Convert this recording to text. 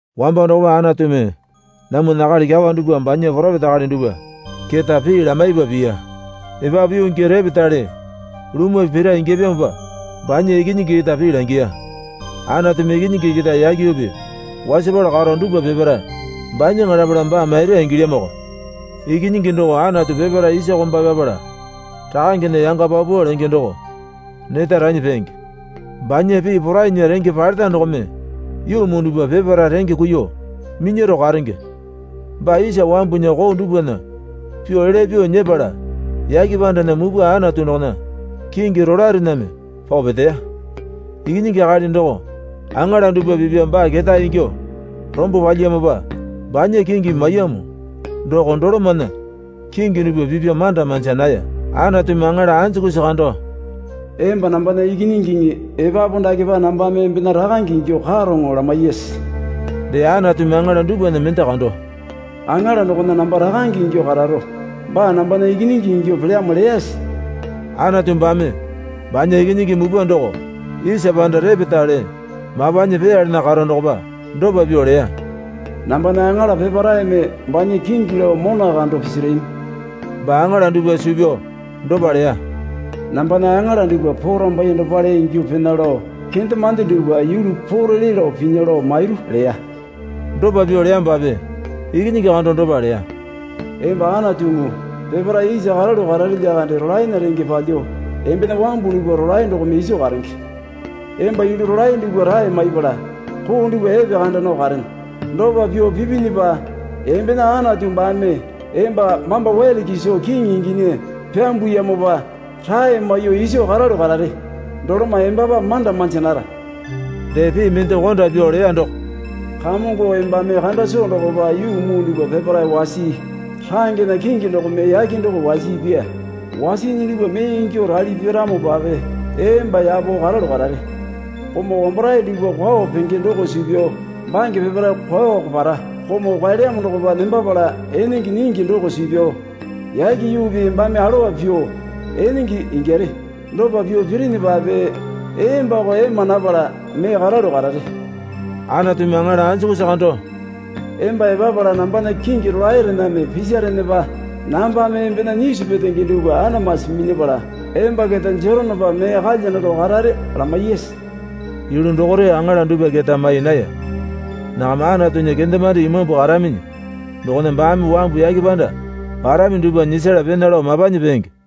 Wambo dokopa Anatumi namwana akali kyawa dupwa banya poropeta akali dupwa keta pii lamaipa piya. Epapu yuu gii repetale lumwa pira ingyapyamopa banya Ikinyingi keta pii langiya. Anatumi Ikinyingi keta yake yuupi wasapala karo dupwa peparae banyaŋa lapala baa maira ingilyamoko. Ikinyingi doko Anatu peparae isa komba pyapala Rakangena yanga paupau lenge doko neta ranyi peenge. Banya pii porainya renge paleta dokome yuu muu dupwa peparae renge kuiyuo minyaro karenge. Baa isa wambunya koo dupwana pyuo elya pyuo nyepala yake pandana mupwa Anatu dokona kingi rolaerename pao peteya. Ikinyingi akali doko aŋala dupwa pipya baa ketae ingyuo rombo palyiyamopa banya kingi maiyamo doko dolomana kingi dupwa pipya manda manja naya. Anatumi aŋala anjukusi kando, Emba nambana ikinyingiŋi epapu dakepa nambame embena Rakange ingyuo karoŋo, lamaiyase? Dee Anatumi aŋala dupwana mende kando, Aŋala dokona namba Rakange ingyuo kararo baa nambana ikinyingi ingyuo pelyamo, leyase? Anatu baame banya Ikinyingi mupwa doko isa panda repetale mapanyi peeyalana karo dokopa dopa pyuo leya. Nambana aŋala peparaeme banya kingi lao mona kando pisarami. Baa aŋala dupwa suu pyao dopa leya. Nambana aŋala dupwa porambaiye dopale ingyuo pena lao kendemande dupwa yulu poo rele lao pinya lao mairu, leya. Dopa pyuo leyamopape Ikinyingi kando dopa leya. Emba Anatuŋu, peparae isa karalu karare lyakande rolaena renge palyuo embena wambu dupwa rolae dokome iso karenge. Emba yulu rolae dupwa rae maipala koo dupwa epekanda nao karene. Dopa pyuo pipinyipa embena Anatu baame emba mamba wele kiso kiŋi inginyi pyambuyamopa rae maiyuo iso karalu karare. Doloma embapa manda manja nara. Dee pii mende konda pyuo leya doko, Kamongo embame kanda soo dokopa yuu muu dupwa peparae wasii. Rangena kingi dokome yake doko wasiipya. Wasiinyi dupwa mee ingyuo rali piramopape emba yapo karalu karare. Komau wambarae dupwa kwao penge doko suu pyao bange peparae kwaoko para. Komau kwaelyamo dokopa nembapala enenge nyingi doko suu pyao yake yuupi embame alowa pyuo enenge ingyare. Dopa pyuo pirinyipape embako ema napala mee karalu karare. Anatumi aŋala anjukusi kando, Emba epapala nambana kingi rolaerename pisarinyipa nambame embena nyisu petenge dupwa Anamasi minyapala emba keta jeronopa mee kalya naro karare, lamaiyase? Yulu dokore aŋala dupwa keta mai naya. Nakama Anatunya kendemande imambu karaminyi dokona baame wambu yake panda parami dupwa nyisala pena lao mapanyi peenge.